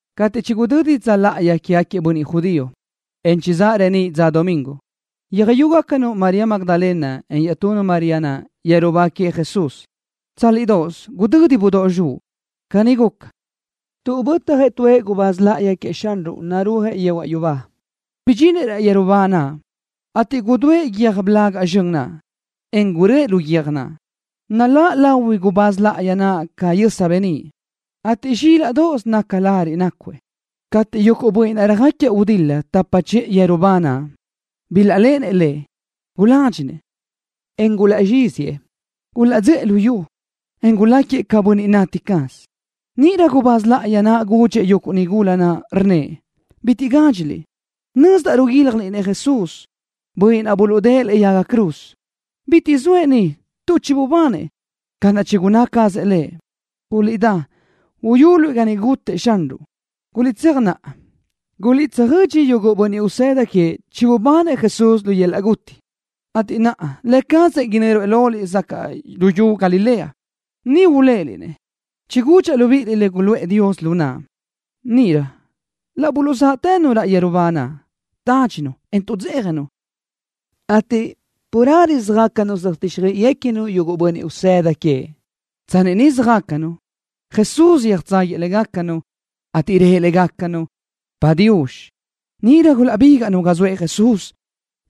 Cateʼ chigudödi dza láʼayi quégaquiëʼ bönniʼ judío, en chizáʼ reníʼ dza domingo, yöjyúgacanu María Magdalena en iaʼtunu María naʼ yeru ba queëʼ Jesús. Tsálidoʼos gudödi budóʼ zxuʼ. Caní guca, tuʼ bötjëʼ tuëʼ gubáz láʼayi queëʼ Xanruʼ narúajëʼ yehuaʼ yubá. Bidxinëʼ raʼ yeru ba naʼ, ateʼ gudúëʼ guiö́j blaga zxön naʼ, en guröʼë lu guiö́j naʼ. Naláʼ lahui gubáz láʼayi naʼ ca yösa beníʼ, ateʼ zxílaʼdoʼos naca lariʼ nácuëʼ. Cateʼ yuguʼ bönniʼ naʼ röjáquiëʼ gudil-la tapa chiʼë yeru ba naʼ bilaʼléʼenëʼ lëʼ, guládxinëʼ, en gulaʼzxíziëʼ. Gulaʼdzöʼë lu yu, en guláquiëʼ ca bönniʼ nati caz. Níʼirö gubáz láʼayi naʼ gudxëʼ yuguʼ nigula naʼ, rnnëʼ: —Bitiʼ gádxiliʼ. Nözdaʼ ruguíljaliʼ-nëʼ Jesús, bönniʼ naʼ buluʼdë́ʼë lëʼe yaga cruz. Bitiʼ zoëʼ ni tuʼ chibubanëʼ ca naʼ chigunná cazëʼ Lëʼ. Guliʼdá, uyuliʼ ga niʼ gutëʼ Xanruʼ. Guliʼtséaj naʼa, guliʼtsöjödxi yuguʼ bönniʼ usëda queëʼ chibubanëʼ Jesús lu yöl-laʼ guti, ateʼ naʼa Lë cazëʼ inö́ruëʼ loliʼ sacaʼ luyú Galilea. Niʼ uléʼeliʼ-nëʼ. Chigudxaʼ libíʼiliʼ le guluʼë Dios lu naʼa. Níʼirö laʼ buluʼzáʼtënu raʼ yeru ba naʼ, tádxinu, en tuʼdzéjanu, ateʼ carelö söjácanu söjtíxjöiʼiguequinu yuguʼ bönniʼ usëda queëʼ. Tsanni niʼ söjácanu, Jesús yöjtságuiëʼ légacanu, ateʼ rëʼ légacanu: —Padiux. Níʼirö gulaʼbígaʼnu ga zoëʼ Jesús,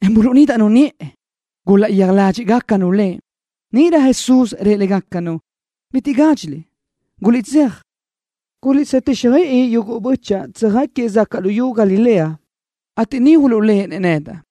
en buluʼnídaʼnu niʼë. Gulaʼyéaj ládxiʼgacanu Lëʼ. Níʼirö Jesús rëʼ légacanu: —Bitiʼ gádxiliʼ. Guliʼtséaj, guliʼtsöjtíxjöiʼi yuguʼ bö́chaʼa tsöjáquiëʼ sacaʼ luyú Galilea, ateʼ niʼ uluʼléʼenëʼ nedaʼ.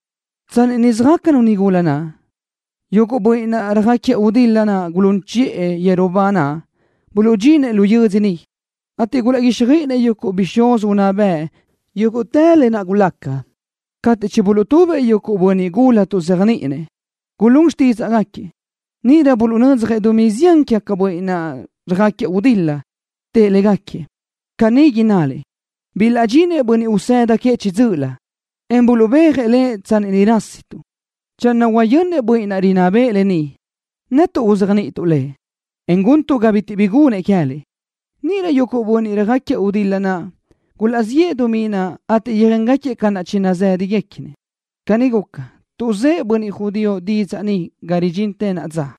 Tsanni niʼ söjácanu nigula naʼ, yuguʼ bönniʼ naʼ röjáquiëʼ gudil-la gulún chiʼë yeru ba naʼ buluʼdxinëʼ lu yödzö niʼ, ateʼ gulaʼguíxjöiʼinëʼ yuguʼ bixúz unná bëʼ yúguʼtë lë naʼ gulaca. Cateʼ chibuluʼtubëʼ yuguʼ bönniʼ gula tuʼzéajniʼinëʼ, gulún xtídzaʼgaquiëʼ. Níʼirö buluʼnödzjëʼ dumí zián quégaquiëʼ bönniʼ naʼ röjáquiëʼ gudil-la. Tëʼ légaquiëʼ: —Caní innaliʼ: “Bilaʼdxinëʼ bönniʼ usëda queëʼ chiʼi dzö́ʼölö, en buluʼbéajëʼ Lëʼ tsanni niʼ rásituʼ.” Channö huayönnëʼ bönniʼ rinná bëʼë lë ni, netuʼ uzéajniʼituʼ lëʼ, en guntuʼ ga bitiʼ bi gunëʼ queë́liʼ. Níʼirö yuguʼ bönniʼ röjáquiëʼ gudil-la naʼ gulaʼziʼë dumí naʼ ateʼ yöjéngaquiëʼ ca naʼ chinazë́dagaquiëʼ. Caní guca, tuʼzë́ʼ bönniʼ judío didzaʼ ni ga ridxintë naʼa dza.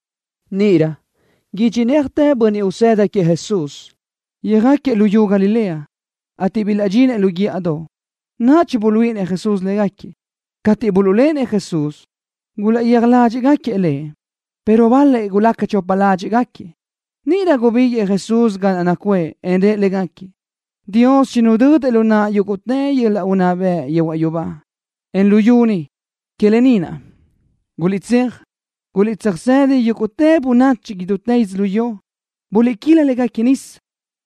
Níʼirö idxinéajtëʼ bönniʼ usëda queëʼ Jesús yöjáquiëʼ luyú Galilea, ateʼ bilaʼdxinëʼ lu guíʼadoʼ naʼ chibuluíʼinëʼ Jesús légaquiëʼ. Cateʼ buluʼléʼenëʼ Jesús, gulaʼyéaj ládxiʼgaquiëʼ Lëʼ, pero bal-lëʼ gulaca chopa ládxiʼgaquiëʼ. Níʼirö gubíguiʼë Jesús ga naʼ nacuʼë, en rëʼ légaquiëʼ: —Dios chinudödëʼ lu naʼa yúguʼtë yöl-laʼ unná bëʼ yehuaʼ yubá, en luyú ni. Que lë ni naʼ, guliʼtséaj, guliʼtsöjsëdi yúguʼtë bönachi idútë yödzölió. Buliʼquíla légaquiëʼ nisa,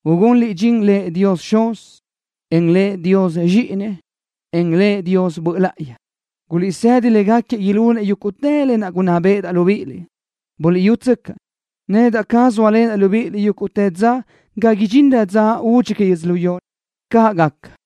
ugunliʼ dxin Lëʼ Dios Xuz, en Lëʼ Dios Zxíʼini, en Lëʼ Dios Böʼ Láʼayi. Guliʼsëdi légaquiëʼ ilunëʼ yúguʼtë lë naʼ gunná béʼedaʼ libíʼiliʼ. Buliʼyútsöcaʼ, nedaʼ caz zóalenaʼ libíʼiliʼ yúguʼtë dza ga idxinrö dza údxi que yödzölió. Caʼ gaca.